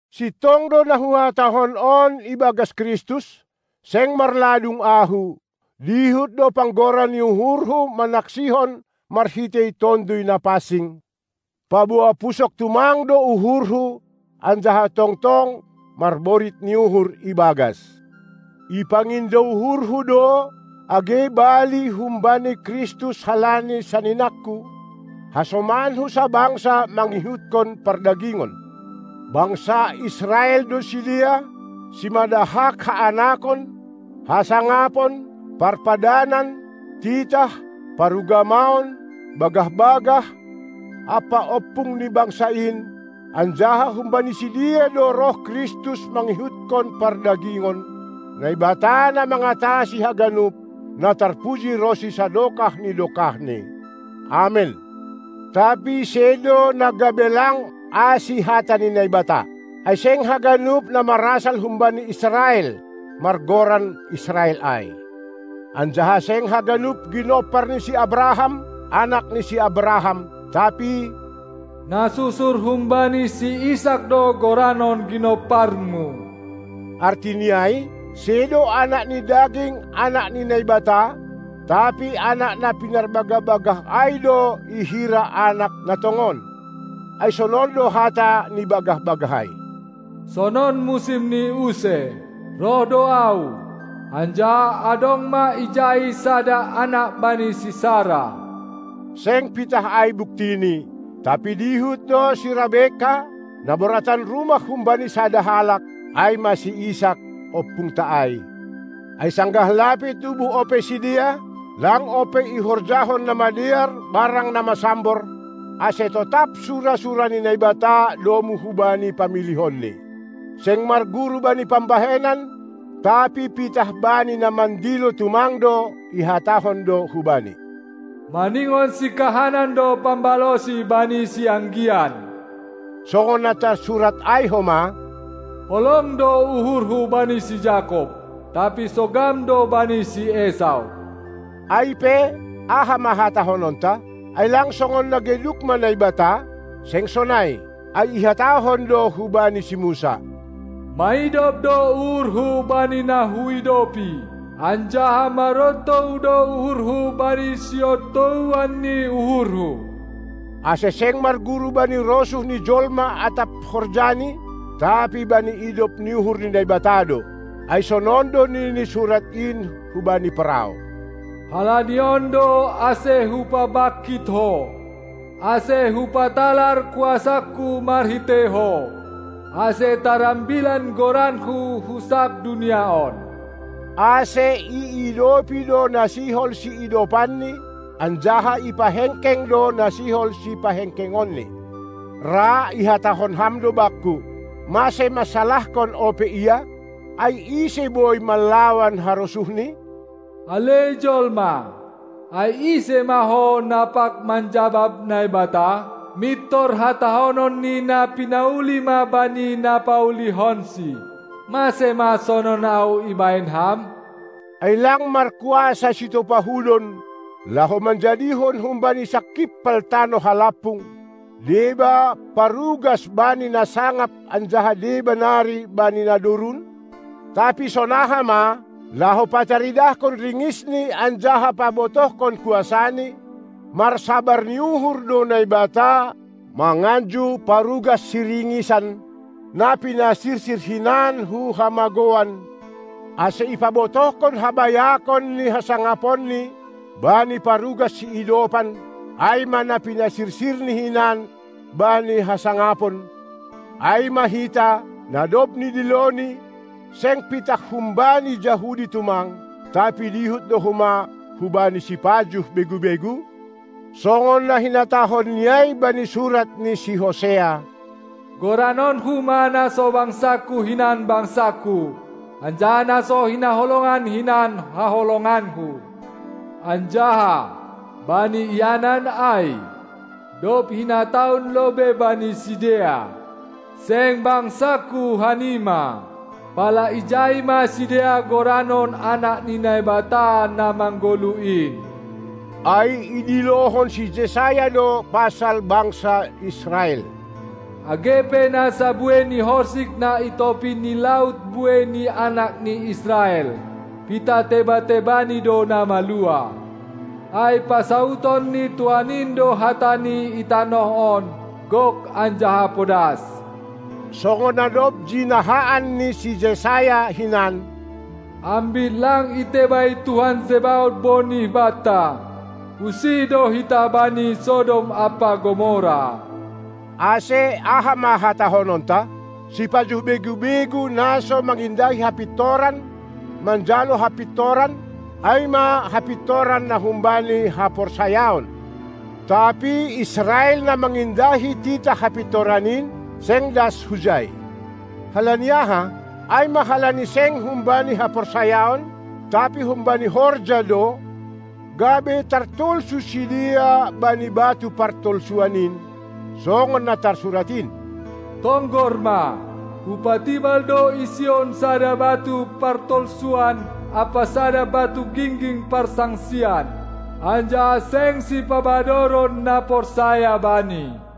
Sintong do na huhatahon on ibagas Kristus, seng marladung ahu, dihut do panggora ni uhurhu manaksihon marhitei Tonduy Na pansing, paboa pusok tumang do uhurhu anjaha tongtong marborit ni uhur ibagas. Ipangindo uhurhu do age bali humbani Kristus halani saninangku, hasomanku sabangsa mangihutkon pardagingon. Bangsa Israel do sidea, simada hak haanakon, hasangapon, parpadanan, titah, parugamaon, bagah-bagah, ampa ompung ni bangsa in, anjaha humbani sidea do roh Kristus mangihutkon pardagingon, Naibata na mangatasi haganup, na tarpuji ronsi sadokah ni dokahni, Amen. Tapi sedo na gabe lang asi hata ni Naibata. Ai seng haganup na marasal humbani Israel, margoran Israel ai. Anjaha seng haganup ginompar ni si Abraham anak ni si Abraham, tapi: Na susur humbani si Isak do goranon ginomparmu. Artini ai: Sedo anak ni daging anak ni Naibata, tapi anak na pinarbagah-bagah ai do ihira anak na tongon. Ai sonon do hata ni bagah-bagah ai: Sonon musimni use, roh do Ahu, anjaha adong ma ijai sada anak bani si Sara. Seng pitah ai buktini, tapi dihut do si Rabekka, na boratan rumah humbani sada halak, ai ma si Isak, ompungta ai. Ai sanggah lape tubuh ope sidea, lang ope ihorjahon na madear barang na masambor, ase totap sura-sura ni Naibata domu hubani pamilihonni. Seng marguru bani pambahenan, tapi pitah bani na mandilo tumang do, ihatahon do hubani: Maningon sikahanan do pambalosi bani sianggian. Songon na tarsurat ai homa: Holong do uhurhu bani si Jakob, tapi sogam do bani si Esau. Ai pe, aha ma hatahononta? Ai lang songon na geduk ma Naibata? Seng sonai. Ai ihatahon do hubani si Musa: Maidop do uhurHu bani na Huidopi, anjaha marontou do uhurHu bani siontouan ni uhurHu. Ase seng marguru bani rosuh ni jolma atap horjani, tapi bani idop ni uhur ni Naibata do. Ai sonon do nini surat in hubani Parao: Halani on do ase Hupabangkit ho, ase Hupatalar kuasangKu marhitei ho, ase tarambilan goranKu hu sab dunia on. Ase iidopi do na sihol siidopanNi, anjaha ipahengkeng do na sihol sipahengkengonNi. Ra ihatahon ham do bakku: Mase mansalahkon ope Ia? Ai ise boi manlawan harosuhNi? Ale jolma, ai ise ma ho, na pag manjabab Naibata? Mintor hatahonon ni na pinauli ma bani na paulihonsi: Mase ma sonon ahu ibahen ham? Ai lang markuasa sitopa hudon, laho manjadihon humbani sangkimpal tanoh halampung, deba parugas bani na sangap anjaha deba nari bani na dorun? Tapi sonaha ma, laho pataridahkon ringisNi anjaha pabotohkon kuasaNi, marsabar ni uhur do Naibata manganju parugas siringisan, na pinasirsir hinan hu hamagouan, ase ipabotohkon habayakon ni hasangaponNi bani parugas siidopan, ai ma na pinasirsirNi hinan bani hasangapon, ai ma hita, na dob nidiloNi, seng pitah humbani Jahudi tumang, tapi dihut do homa humbani sipajuh begu-begu? Songon na hinatahonNi ai bani surat ni si Hosea: GoranonKu ma na so bangsangKu hinan bangsangKu, anjaha na so hinaholongan hinan haholonganKu. Anjaha, bani ianan ai, dob hinatahon lobei bani sidea: "Seng bangsangku hanima", pala ijai ma sidea goranon anak ni Naibata na manggoluh in. Ai idilohon si Jesaya do pasal bangsa Israel: Age pe na sa buei ni horsik na i topi ni laut buei ni anak ni Israel, pitah teba-tebani do na maluah. Ai pasaudon ni Tuhan in do hataNi i tanoh on gok anjaha podas. Songon na dob jinahaan ni si Jesaya hinan: Ambit lang itebai Tuhan Zebaot bonih banta, usih do hita bani Sodom ampa Gomora. Ase aha ma hatahononta? Sipajuh begu-begu na so mangindahi hapintoran, manjalo hapintoran, ai ma hapintoran na humbani haporsayaon. Tapi Israel, na mangindahi titah hapintoran in, seng das hujai. Halani aha? Ai ma halani seng humbani haporsayaon, tapi humbani horja do, gabe tartolsu sidea bani batu partolsuan in, songon na tarsurat in: Tonggor ma, hupatibal do i Sion sada batu partolsuan ampa sada batu gingging parsangsian, anjaha seng sipabadoron na porsaya Bani.